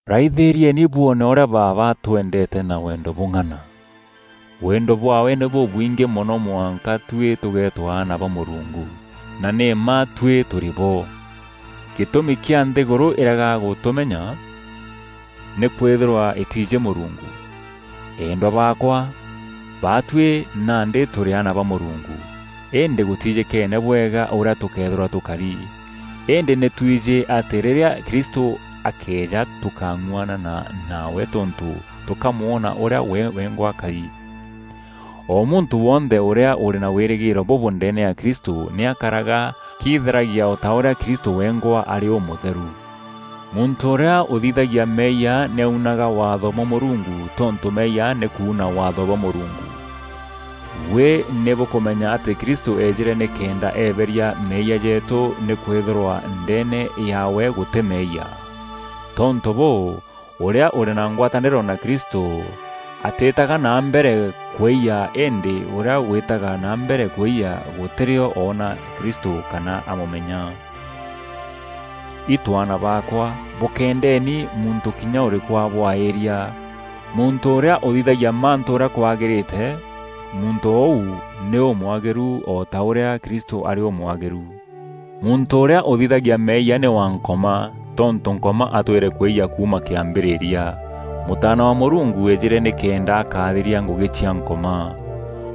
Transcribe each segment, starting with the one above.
Raithîrieni bwoone ûrîa Baaba atwendeete na wendo bûng'ana! Wendo bwaawe nî bûbwingî mono mwanka tuî tûgeetwa aana ba Mûrungu, na nî mma tuî tûrî bo. Gîtûmi kîa nthîgûrû îrega gûtûmenya nî kwîthîrwa îtiijî Mûrungu. Eendwa baakwa, baatuî nandî tûrî aana ba Mûrungu, îndî gûtijîkeene bwega ûrîa tûkeethîrwa tûkari. Îndî nî twijî atî rîrîa Kristû akeeja tûkang'uanana nawe tontû tûkamwona ûrîa we wengwa akari. O muntû wonthe ûrîa ûrî na wîrîgîîro bûbû ndeene ya Kristû nî akaraga akitheragia o ta ûrîa Kristû wengwa arî ûmûtheru. Muntû ûrîa ûthithagia meeyia nî aunaga Waatho bwa Mûrungu tontû meeyia nî kuuna Waatho bwa Mûrungu. Buî nî bûkûmenya atî Kristû eejîre nîkenda eeberia meeyia jeetû nîkwîthîrwa ndeene yaawe gûtî meeyia. Tontû bûû, ûrîa ûrî na ngwatanîro na Kristû atîîtaga na mbere kwîyia îndî ûrîa wîîtaga na mbere kwîyia gûtî rîo oona Kristû kana amûmenya. Itû aana baakwa, bûkéendeni muntû kinya ûrîkû abwaîria. Muntû ûrîa ûthithagia mantû ûrîa kwagîrîte, muntû ûu nî ûmwagîru o ta ûrîa Kristû arî ûmwagîru. Muntû ûrîa ûthithagia meeyia nî wa Nkoma, tontû Nkoma atwîre kwîyia kuuma kîambîrîria. Mûtaana wa Mûrungu eejîre nîkenda akathiria ngûgî cia Nkoma.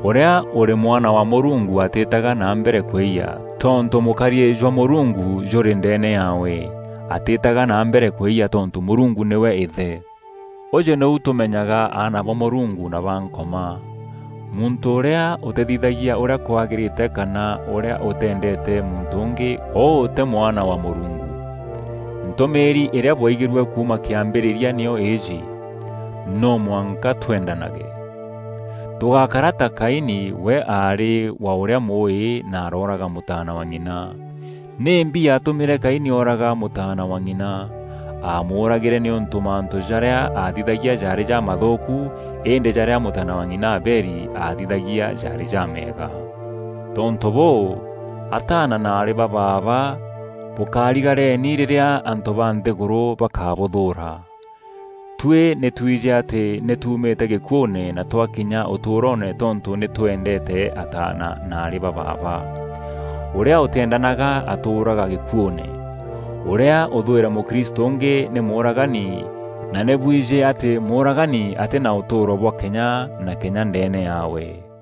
Ûrîa ûrî mwana wa Mûrungu atîtaga na mbere kwîyia, tontû mûkariî jwa Mûrungu jûrî ndeene yaawe, atîtaga na mbere kwîyia tontû Mûrungu nîwe Îthe. Ûjû nîu tûmenyaga aana ba Mûrungu na ba Nkoma: muntû ûrîa ûtîthithagia ûrîa kwagîrîte kana ûrîa ûtîendeete muntû ûngî ûû tî mwana wa Mûrungu. Ntûmîîri îrîa bwaigîrue kuuma kîambîrîria nîyo îîjî: no mwanka twendanage. Tûgákara ta Kaini we aarî wa ûrîa Mûûî na arooraga mûtaana wa ng'ina. Nîmbi yatûmîre Kaini ooraga mûtaana wa ng'ina? Aamûragîre nîûntû mantû jarîa aathithagia jaarî jamathûûku, îndî jarîa mûtaana wa ng'ina Abeli aathithagia jaarî jameega. Tontû bûû, ataana na aarî ba baaba bûkarigareni rîrîa antû ba nthîgûrû bakûbûthûûra. Tuî nî twijî atî nî tuumîte gîkuûne na twakinya ûtûûroone tontû nî twendeete ataana na aarî ba baaba. Ûrîa ûtîendanaga atûûraga gîkuûne. Ûrîa ûthwîre mûkristû ûngî nî mûûragani na nî bwijî atî mûûragani atî na ûtûûro bwa kenya na kenya ndeene yaawe.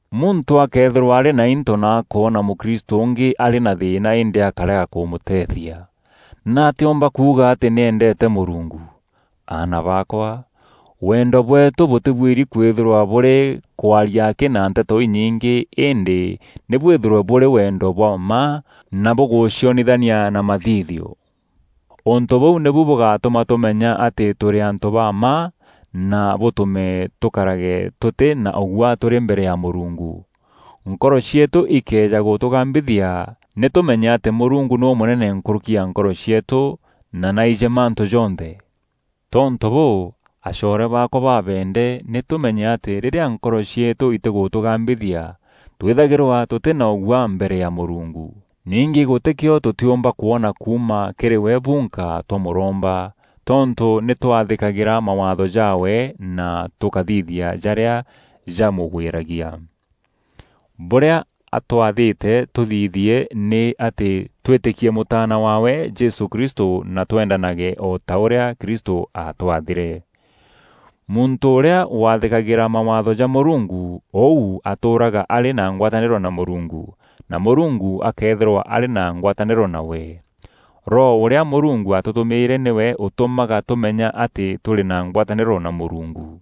Muntû akëethîrwa arî na into na akoona mûkristû ungî arî na thîîna îndî akárega kûmûteethia, nîatîa omba kuuga atî nî endete Mûrungu? Aana baakwa, wendo bweetû bûtîbuîri kwîthîrwa bûrî kwaria akî na nteto inyingî îndî nî bwîthîrwe bûrî wendo bwa mma, na bûgûcionithania na mathithio. Ûntû bûu nîbu bûgatûma tûmenya atî tûrî antû ba mma na bûtûme tûkarage tûtî na ûguaa tûrî mbere ya Mûrungu. Nkoro cieetû ikëeja gûtûgambithia, nî tûmenye atî Mûrungu nî ûmûnene nkûrûki ya nkoro cieetû na nî aijî mantû jonthe. Tontû bûû, acoore baakwa babeende nî tûmenye atî rîrîa nkoro cieetû itîgûtûgambithia, twîthagîrwa tûtî na ûguaa mbere ya Mûrungu. Ningî gûtîkîo tûtîûmba kwona kuuma kîrî we bunka twamûromba, tontû nî twathîkagîra mawaatho jaawe na tûkathithia jarîa jamûgwîragia. Bûrîa atwathîte tûthithie nî atî twîtîkie Mûtaana waawe Jesû Kristû na twendanage o ta ûrîa Kristû aatwathîre. Muntû ûrîa wathîkagîra mawaatho ja Mûrungu ûu atûûraga arî na ngwatanîro na Mûrungu, na Mûrungu akeethîrwa arî na ngwatanîro nawe. Roho ûrîa Mûrungu atûtûmîre nîwe ûtûmaga tûmenya atî tûrî na ngwatanîro na Mûrungu.